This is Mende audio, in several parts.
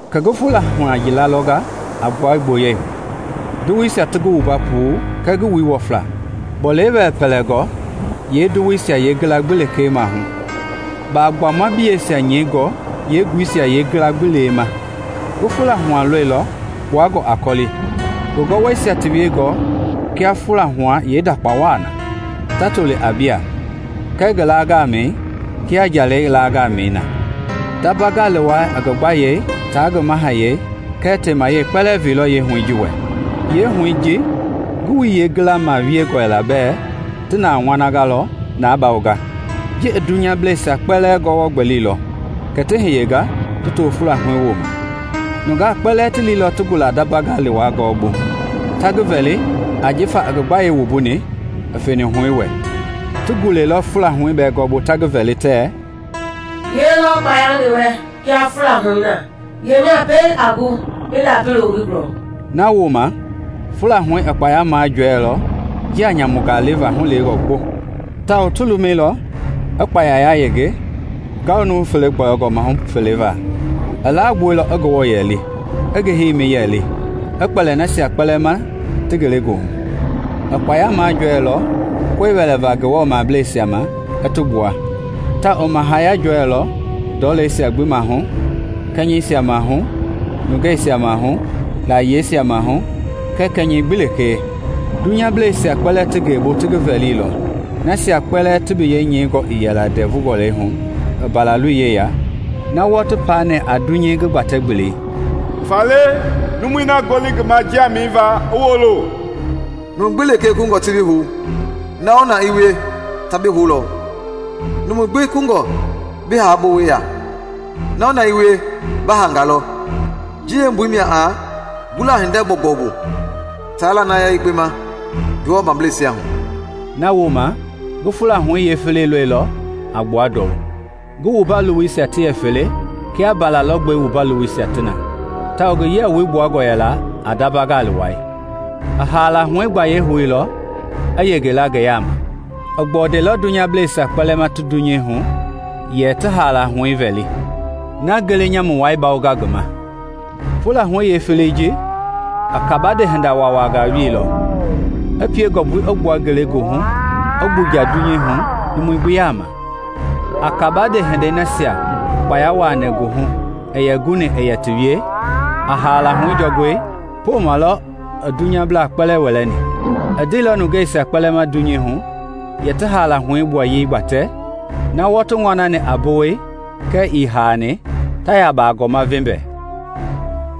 Kɛ ngi fula hua yila lɔnga a gbua gboyei hu, Ndowoisia ti ngi ma puu kɛɛ ngi wui i wɔfla, a bɔlei pɛlɛngɔ yeendowoi yeengila gbi lee maahu, bagbuama biyeisia nyɛingɔ yeenguisia yeengila gbi lee ma. Ngi huɛi lɔilɔ kpuangɔ a kɔli, ngi gɔwɔisia ti wiengɔ kia fula huɛi yeendakpa waa na ta toli a biaa, kɛɛ ngi laa gamɛi kia njalɛi laa gamɛi na. Ndamba gali wai i ngi gbayei taa ngi mahayɛi kɛɛ temayei kpɛlɛɛ veilɔ yeehuɛi ji wɛ. Yeehuɛi ji ngi wui yeengila maahu wiengɔ yɛla bɛ ti na ŋɔnangɔ lɔ na bawonga. Ji i dunyableisia kpɛlɛɛ gɔwɔ gbɛlilɔ kɛ ti hiyenga ti to fula huɛi woma. Nunga kpɛlɛɛ ti liilɔ ti gula Ndamba gali wai gɔɔbu ta ngi vɛli jifa i ngi gbayei wumbuni i feni huɛi wɛ. Ti gulailɔ fula huɛi bɛɛ gɔɔbu ta ngi vɛli tɛ, “Yelɔ kpaya ngi wɛ kia fula huɛi na? Yemia pɛiŋ a gu i ndapi loo ngi gulɔ?” Nawooma fula huɛi i kpaya jɔɛilɔ njia nyamunga leva hulewengɔ gboŋ tawao ti lumɛilɔ i kpaya yayenge ngawu nuu-fele gbɔyɔngɔ mahu fele va. I lagbuailɔ i Ngewɔ yɛli, i ngi heimi yɛli i kpɛli nasia kpɛlɛɛ ma ti ngelegoohu. I kpaya majɔɛilɔ koe wɛlɛva Ngewɔ mableisa ma i ti gbua. Tawao i mahaya jɔɛilɔ ndɔleisia gbi maahu, kɛnyɛbleisia maahu, nungeisia maahu, layiesia mahu, kɛɛ kɛnyɛi gbi lekee. Dunyableisia kpɛlɛɛ ti ngeebu ta ngi vɛlilɔ, nasia kpɛlɛɛ ti biyɛi nyɛingɔ ii le ndɛvu gɔlɛi hu i Mbalaloi yeya na wɔɔ ti paani a dunyei ngi gbatɛ gbeli. “Faale, numu na ngoli ngi ma njia mɛniva, i woolo! Numu gbi lee kungɔ ti bii hou, na-o-na i wie ta bi houlɔ; numui kungɔ bi haa bowei ya, na-o-na i wie ba haangalɔ. Ji yeembui mia a gula hinda gbɔugbɔu bu taa lanaya yekpe ma Ngewɔ mableisia hu.” Nawooma ngi fula huɛi yeefeleyei lɔilɔ a gbua ndɔu. Ngi wumba lowoi yɛ fele kia mbala lɔgbɛi wumba lowoisia na, tawao ngi yia woi gbuangɔ yɛla a ndamba gali wai. I haala huɛi gbayei houilɔ i yengela ngi yaama. I gbɔndailɔ dunyableisia kpɛlɛɛ ma ti dunyei hu yɛ ti haala huɛi vɛli, na ngele nyamui wai yɛ bawonga ngi ma. Fula huɛi yeefeleyei ji i kabande hinda wawangaa wielɔ, i pie ngɔmbui i gbua ngelegoohu i gbuja dunyei hu numui gbi yaama. A kabande hinde nasia kpaya wuaani ngi hu i guni i yɛ ti wie a haala huɛi jɔngɔi, poma lɔ i dunyablaa kpɛlɛɛ wɛlɛni. I ndeilɔ nungeisia kpɛlɛɛ ma dunyei hu yɛ ti haala huɛi ngi gbuaye gbatɛ, na wɔɔ ti ŋɔnani a bowei kɛɛ ii haani, ta ya bagɔɔma vembɛ.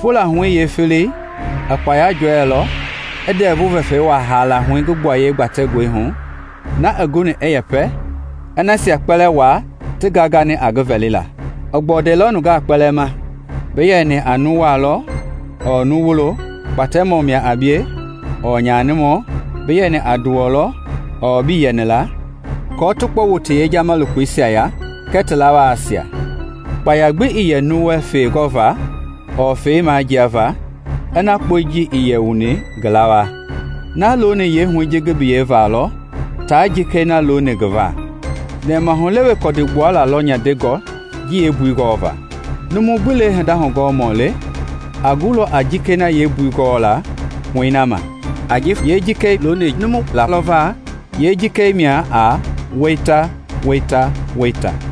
Fula huɛi yeefeleyei i kpaya jɔɛilɔ i ndɛvu vɛfɛi wuaa haala huɛi ngi gbuayei gbatɛngɔi hu, na i guni i yɛpɛ i nasia kpɛlɛɛ waa ti gangani a ngi vɛlila. I gbɔndailɔ nungaa kpɛlɛɛ ma, bi yɛni a nu walɔ ɔɔ nu wulo, kpatɛmɔ mia a bie ɔɔ nyanimɔ, bi yɛni a nduwɔ lɔ ɔɔ bii yɛni la, aako ti kpɔ wu ti yejama lokoisia ya kɛɛ ti lawaasia. Kpaya gbii yɛ nuu wɛ feegɔva ɔɔ feemanjiava ina kpɔi ji ii wuni ngi lawaa, na looni yeehuɛi ji ngi biyei va lɔ taa jikei na looni ngi va. Nɛmahulewe kɔdi gbuala lɔ nyandengɔ ji yeembui gɔlɔva. Numui gbi lee hinda hugɔɔmɔ le a gulɔ a jikei na yeembui gɔɔla i huɛi na ma, ajifa yeejikei looni numu la lɔ va. Yeejikei mia a weita weita weita.